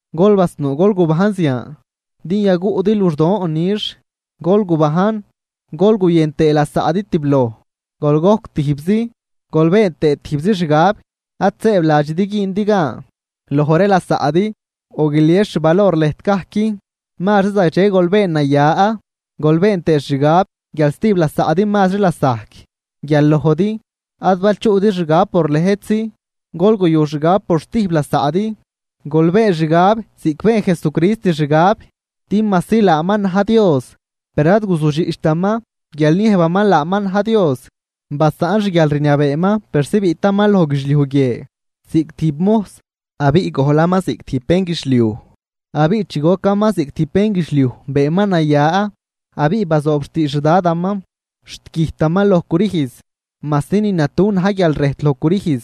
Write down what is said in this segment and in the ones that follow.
Gol basnuu gol gubajn zian din yaguꞌdi luxdoon nix. Gol gubajn, gol guyën tëë lasaꞌdi tibloj, gol gojc tijbzi, gol been tëë tijbzi xgab. Ad sëëbladxidi güündi gan loj ree lasaꞌdi o guilies xvalor lëjt gajc, mazri zagdxe gol been naya, gol been tëë xgab guial stijb lasaꞌdi mazri lasajc guial lojdi. Ad bal chuꞌdi xgab por lëjtzi, gol guyu xgab por stijb lasaꞌdi. Gol been xgab ziꞌc been Jesucrist xgab. Din majsi laaman na̱j Dios, per ad guzudxiꞌchtaman guial niëjbaman laaman na̱j Dios. Basaꞌn xguialrniabeeman persi biꞌtaman loj guidxliuj guie ziꞌc tijb mojs abiꞌ gojlaman ziꞌc tijb bénguidxliuj. Abiꞌ chi gocaman ziꞌc tijb bénguidxliuj beenman naya abiꞌ bazoob xtiidx xDadaman, xt güjtaman loj crüjz, majsi ni natu na̱j guial rëjt loj crüjz.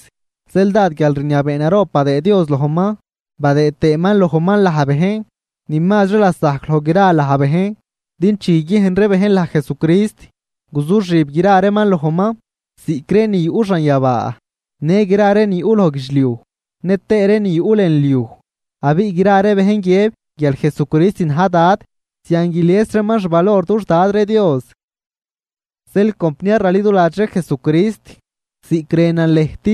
Zeel dád guialrniabee naroob badëë Dios lojman, badëë tëëman lojman laj bejn ni mazri lasajc loj gra laj bejn. Din chi guiguiejn ree bejn laj Jesucrist, guzuxib gra reeman lojman, ziꞌc ree ni yuꞌ xanyabaa, në gra ree ni yuꞌ loj guidxliuj, nëtëë ree ni yuꞌ lën liuj. Abiꞌ gra bejn guiëb guial Jesucrist na̱j Dad, zian guilies reeman xvalor dux Dad ree Dios. Zeel compniar raliduladx ree Jesucrist, ziꞌc rënan lëjt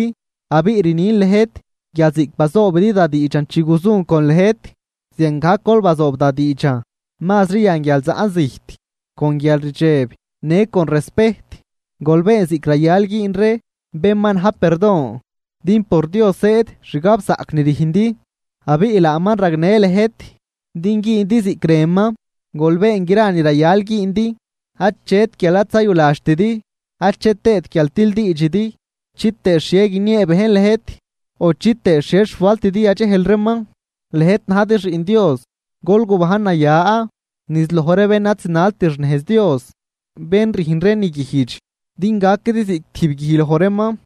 abiꞌ rnin lëjt guial ziꞌc bazoobidi da diidxan chi guzun con lëjt, ziangajc gol bazoob da diidxan mazri yan guial zaꞌn zijt. Con guialrdxeb në con respejt gol been ziꞌc rayal güün ree bén ma na̱j perdon. Din por Dios zëëd xgabzaꞌc ni rüjndi, abiꞌ laaman ragnë lëjt din güündi ziꞌc rënman. Gol been gra ni rayal güündi, achet guial ad zayuladxtidi achet tëët guial tildiidxidi, chitëë xhie guiniee bejn lëjt o chitëë xhie xfaltidi yadxejl reeman. Lëjt najdi xiꞌn Dios gol gubajn naya niz loj ree bén ad zinalt xnejz Dios, bén rüjn ree ni guijdx. Din gaquidi ziꞌc tijb guij loj reeman,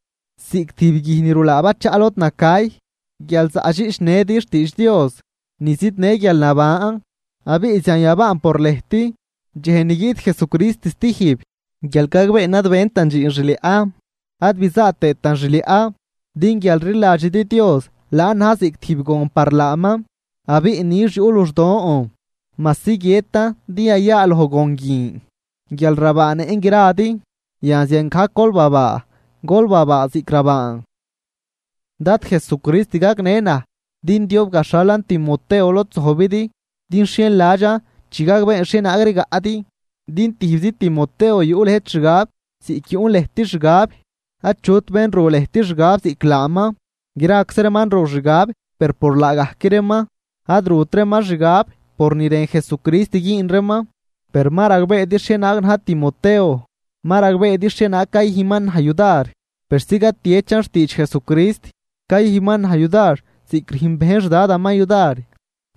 ziꞌc tijb guij ni rulaa bachaꞌ lod nacay, guial zaꞌdxiꞌchnëdi xtiidx Dios ni zidnë guialnaban. Abiꞌ zian yabaan por lëjt dxej ni guiꞌt Jesucrist stijb guial gagbeen ad bentan dxiin xliaꞌ ad bizaa tëëtan xliaꞌ. Din guial rliladxidi Dios laan na̱j ziꞌc tijb gon par laaman, abiꞌ nix yuꞌ luxdon majsi guiëtan din yayaaloj gon guin guial rabaanëꞌn gradi. Yan ziangajc gol babaa, gol babaa ziꞌc rabaan. Dad Jesucrist gagnë naj din diob gaxhalan Timoteo lod zojbidi din xhienladxan chi gagbeen xhienaag rigaꞌdi. Din tijbzi Timoteo yuꞌ lëjt xgab ziꞌc yuꞌn lëjt xgab. Achut bén ru lëjt xgab ziꞌc laaman. Graczi reeman ru xgab per por laagajc reeman, ad rut reeman xgab por ni rën Jesucrist güün reeman. Per ma ragbeedi xhienaag na̱j Timoteo, ma ragbeedi xhienaag cayüjnman naj yudar persi catiechan xtiidx Jesucrist. Cayüjnman naj yudar ziꞌc rüjn bejn xDadaman yudar.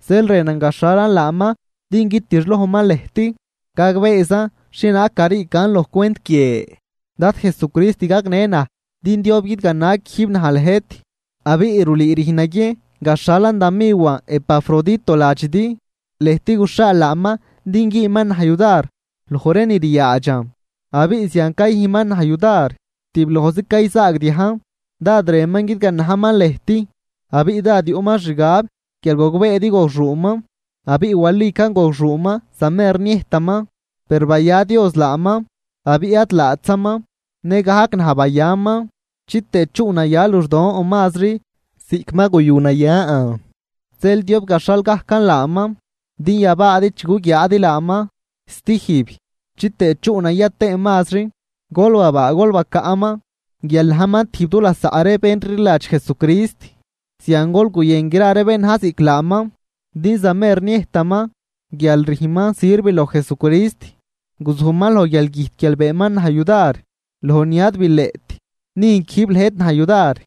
Zeel rënan gaxhalan laaman din guitixlojman lëjt, gagbeezan xhienaag gariican loj cwent guie Dad Jesucrist gagnë naj din diob guidgana quijb naj lëjt. Abiꞌ rulüü rüjn naguiejn gaxhalan da miwan Epafrodito ladxidi. Lëjt guxhaal laaman din güünman naj yudar loj ree ni ryaadxan. Abiꞌ zian cayüjnman naj yudar, tiblojzi cayzaagdiajn. Dád rënman guidganajman lëjt abiꞌ dád yuꞌman xgab guial gogbeedi gogxuuman. Abiꞌ walican gogxuuman zamer niëjtaman. Per baya Dios laaman, abiꞌ ad laatzaman, nëgajc naj bayaman, chitëë chuꞌnaya luxdon mazri ziꞌc ma guyu nayan. Zeel diob gaxhal gajcan laaman din yabaadi chi guguiaadi laaman stijb chitëë chuꞌnaya tëën mazri. Gol babaa, gol bacaꞌman guial najman tijb du lasaꞌ ree bén rliladx Jesucrist. Zian gol guyën gra ree bén na̱j ziꞌc laaman. Din zamer niëjtaman guial rüjnman sirv loj Jesucrist, guzujman loj guialgüjt guial beenman naj yudar loj ni ad bileꞌt nüjn quijb lëjt naj yudar.